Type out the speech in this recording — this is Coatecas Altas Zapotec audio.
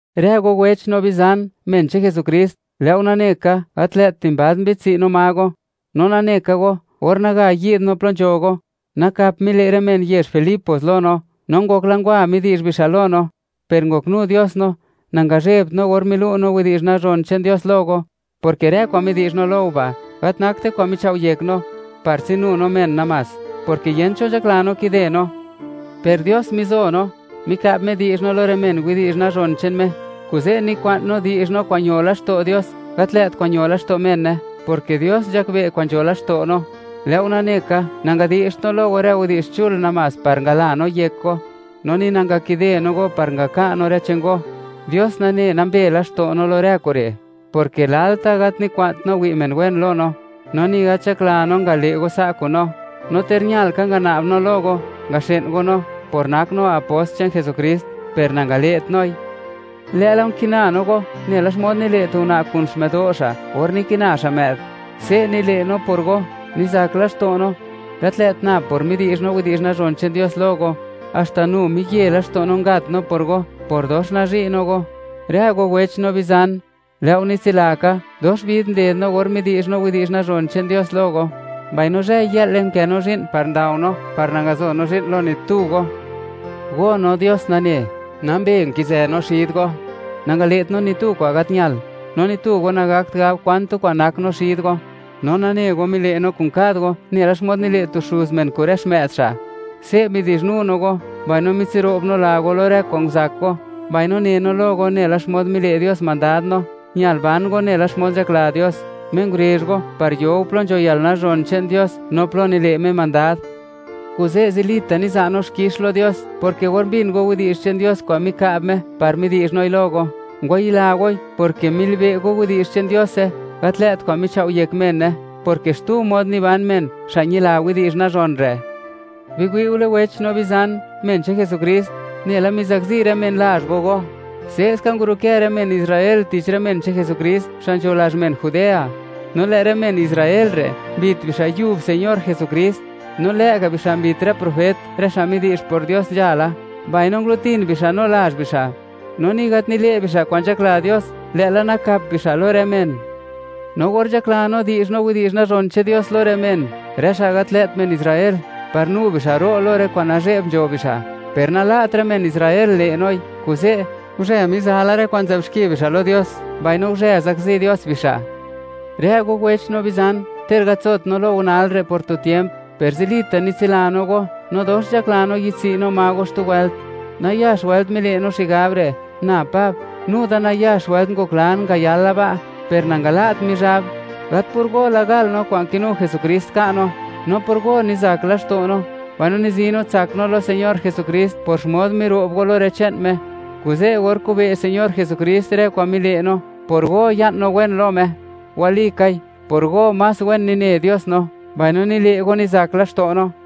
Rë go wech no bizan, men che'n Jesukrist, lë' go nane ka, gat lë't dimbald mbi'dtsi' no ma go. No nane ka go, or naga yi'd no plo nzho go, nakap mile' rë men yezh Filipos lo no, no ngokla ngwa midi'zh bixa' lo no; per ngoknu Dios no, nangazhebt no or milu' no widi'zh nazhon che'n Dios lo go, porke rë kwa'n midi'zh no lo go ba', gat nakte kwa'n michao' yek no, par tsinu no men namás, porke yent cho nzhakla no kide no, per Dios mizo no, mika'b Me di'zh no lo rë men widi'zh nazhon che'n Me, kuze' nikwa'n no di'zh no kwa'n ño laxto' Dios, gat lë't kwa'n ño laxto' mene, porke Dios nzhakbe' kwa'n nzho laxto' no. Lë' go nane ka, nangadi'zht no lo go rë widi'zh chul namás par ngala no yek go, no ni nangakide no go par ngaka' no rë che'n go; Dios nane nambe laxto' no lo rë kure', porke lalta' gat nikwa'nt no wi' men wen lo no, no ni gat nzhakla no ngale' go sa' kun no. No ter ñal ka ngana'b no lo go, ngaxë'n go no, por nak no apost che'n Jesukrist, per nangale't noi, lë'la nkina no go nela xmod nile' tu una' kun xmë'do' xa' or nikina xa' më'd. Se' nile' no por go, nizak laxto' no, gat lë't nab por midi'zh no widi'zh nazhon che'n Dios lo go, haxta nu miye laxto' no ngat no por go por dox nazhi' no go. Rë go wech no bizan, lë' go nitsila ka, dox vid nded no or midi'zh no widi'zh nazhon che'n Dios lo go, mbaino zhë-yë'le nkë no zhi'n par ndao no par nangazo no zhi'n lo ni tu go. Go, no Dios nane, nambe nkizë xid go, nangale't no ni tu kwa'n gat ñal, no ni tu go nagakt gab kwan tu kwa'n nak no xid go. No nane go, mile' no kun kad go nela xmod nile' tu xuz men kun rë xmë'd xa'. Se' midi'zhnu no go, mbaino mitsiro'b no la go lo rë kwa'n nguzak go, mbaino ne no lo go nela xmod mile' Dios mandad no, ñal ban go nela xmod nzhakla Dios, Me ngurezh go par yo go plo nzho yalnazhon che'n Dios no plo nile' Me mandad. Kuze' zilita' niza' no xkix lo Dios, porke or mbin go widi'zh che'n Dios kwa'n mika'b Me par midi'zh noi lo go, ngwayila goi, porke milibe' go widi'zh che'n Diose, gat lë't kwa'n michao' yek mene, porke xtu mod niban men, xa' ñila widi'zh nazhon re'. Biwi'ule wech no bizan, men che'n Jesukrist; nela mizakzi rë men lazh go go, se'ska ngurukë rë men Israel tich rë men che'n Jesukrist, xa' nzho lazh men Judea. No lë' rë men Israel re' mbit bixa' yub Señor Jesukrist, no lë'ga' bixa' mbit rë profet, rë xa' midi'zh por Dios nzhala, mbaino ngulutin bixa' no lazh bixa'. No ni gat nile' bixa' kwa'n nzhakla Dios, lë'la nakap bixa' lo rë men. No or nzhakla no di'zh no widi'zh nazhon che'n Dios lo rë men, rë xa' gat lë't men Israel, par nu bixa' ro' lo rë kwa'n nazhe'b nzho bixa', per nala't rë men Israel le' noi. Kuze', guzhe miza la rë kwa'n nzë'b xki bixa' lo Dios, mbaino guzhe zakzi Dios bixa'. Rë go wech no bizan, ter gat nzot no lo go nal re' por tu tiemp, per zilita' nitsila no go, no dox nzhakla no yi'dtswi' no ma go xtu wëlt. Nayax wëlt mile' no xigab re'; na Pab, nu da nayax wëlt ngoklan ngayala ba', per nangala't Mizhab. Gat por go la gal no kwa'n kinu Señor Jesukrist ka' no, no por go nizak laxto' no, mbaino nizi no tsak no lo Señor Jesukrist por xmod miro'b go lo rë che'n Me. Kuze', or kube' Señor Jesukrist rë kwa'n mile' no, por go ya'n no wen lo Me. Walikai, por go más wen nine Dios no, mbaino nile' go nizak laxto' no.